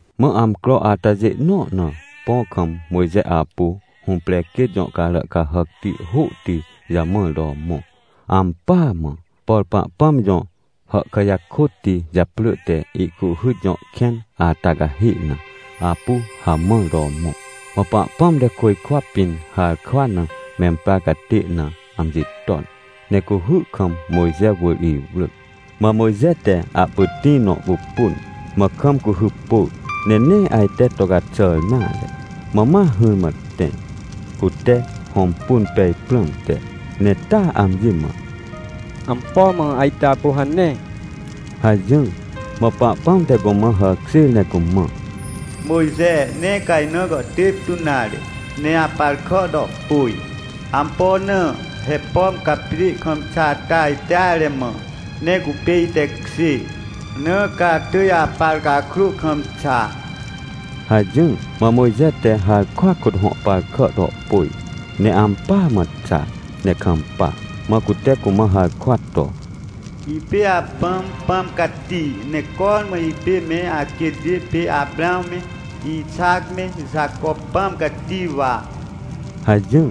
Mã amcro atajê nõ na, põ kam Mojxe apu hũprequêt jõcarà cahàcti hôhti jamãr to mõ. Ampỳa mã, por Pahpãm jõ hàhkà jakôtti japrỳ te Ihcuhhyt jõ kẽn ata cahê na, apu hamãr to mõ. Mã Pahpãm te côjkwa pĩn harkwa na memprarcatê na amji ton, ne cuhy kam Mojxe wỳr iwrỳc. Mã Mojxe te ahpytĩ nõ pupun, mã kam cuhy pôr, ne nee ajte to caxàr nare. Mã ma hỹrmãtẽ, cute hõmpun pej prãmte, ne taa amji mã: — Ampo mã ajte apu hane? — hajỹr. Mã Pahpãm te cumã hàkjêr ne cumã: — Mojxe, nee ca ina gàhtêp tu nare, ne apar kà to pôj. Ampo na? He pomca pjê kam xa ata ajteare mã, ne cupê itekjê, na caatỳj apar cakrô kamxa — hajỹr. Mã Mojxe te harkwa kôthõ par kà to pôj, ne ampỳa mã xa ne kampa. Mã cute cumã harkwa to: — Ipê apãm Pãm Cati, ne cormã ipê me aquêtjê pê Aprãw me, Ixac me, Jaco Pãm Cati wa — hajỹr.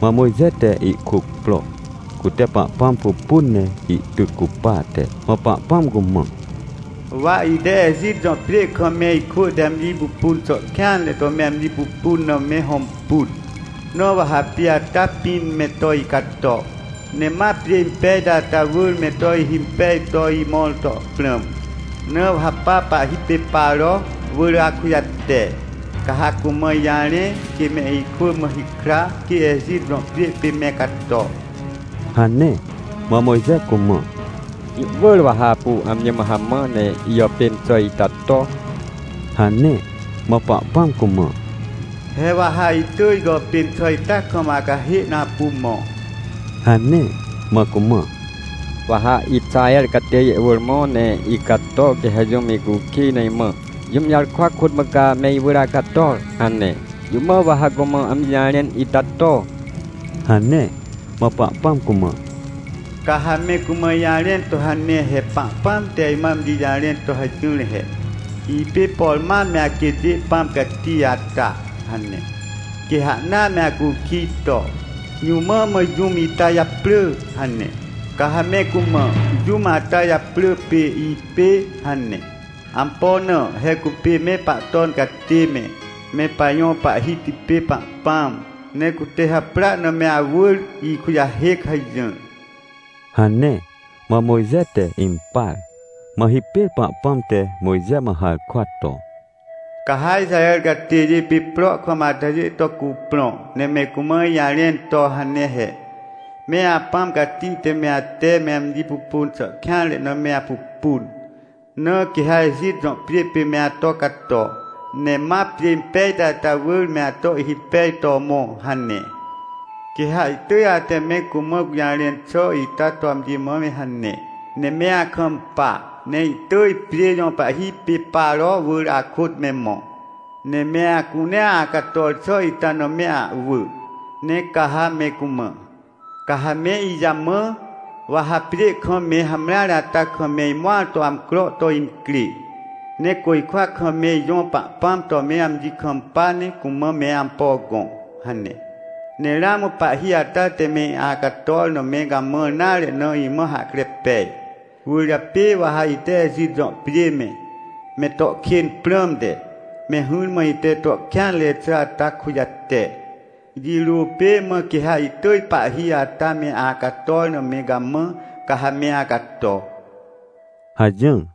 Mã Mojxe te ihkuc pro, cute Pahpãm pupun ne ihtyc cupate. Mã Pahpãmcumã: — Wa ite Ejit jõpjê kam me ikwỳ te amji pupun xà kêanre to me amji pupun na me hõmpun. Nawa ha pjê ata pĩn me to icato, ne ma pjê impejti ata wỳr me to ihimpej toimõr to prãm. Na wa ha pa pahhi pê Paro wỳr akujate, ca ha cumãijarẽ, quê me ikwỳ mãhikra, quê Ejit jõ pjê pê me cato — hane. Mã Mojxe cumã: — Jũ wỳr wa ha apu amji mã hamã, ne ijàpên xà ita to — hane. Mã Pahpãm cumã: — He wa ha itỳj gàpênxà ita kam acahê na apu mõ — hane. Mã cumã: — Wa ha Ixaher catêjê wỳr mõ, neicato, quê ha jũm icukij ne imã: “Jũm jarkwa kôtmã ca me iwỳr acator?” hane. Jũ mã wa ha cumã amji jarẽn ita to? — hane. Mã Pahpãm cumã: — Ca ha me cumã ijarẽn to hane he “Pahpãm te imã amji jarẽn to hajỹr he: ‘Ipê, por mam me aquêtjêPãm Cati ata’” hane. Quê ha ahna me acukij to: “Jũ mã mã jũm itajaprỳ?” hane, ca ha me cumã: “Jũm ata japrỳ pê ‘Ipê’ hane. Ampo na? Hecupê me Pahton catê me, me pajõ Pahhiti pê Pahpãm. Necute haprỳa name awỳr ikujahêc” hajỹr — hane. Mã Mojxe te impar. Mã hipêr Pahpãm te Mojxe mã harkwa to: — Ca ha Ixaher catêjê pê prohkam atajê to cuprõ, ne me cumã ijarẽn to hane he: “MeApãm Cati te me ate me amji pupun xà kêanre na me apupun, na quê ha Ejit jõ pjê pê me ato cato, ne ma pjê impejti ata wỳr me ato ihhimpej to mõ” hane. — Quê ha ihtỳj ate me cumãgũjarẽn xà ita to amji mã me hane, ne me akampa. Ne ihtỳj pjê jõpahhi pê Paro wỳr akôt me mõ, neme acunea acator xà ita na me ahwỳ. Ne ca ha me cumã: “Ca ha me ijamã, wa hapjê kam me hamreare ata kam me imõar to amcro to incrê. Ne côjkwakam me ijõ Pahpãm to me amji kampa ne cumã me ampo gõ” hane. Ne ramã pahhi ata te me acator na me gamãr nare na imã hahkre pej. Cwỳrjapê wa ha ite Ejit jõpjê me, me to kên prãmte, me hỹrmã ite to kêanre xà ata kujate. Jirô pê mã quê ha ihtỳj pahhi ata me acator name gamã, ca ha me acato — hajỹr.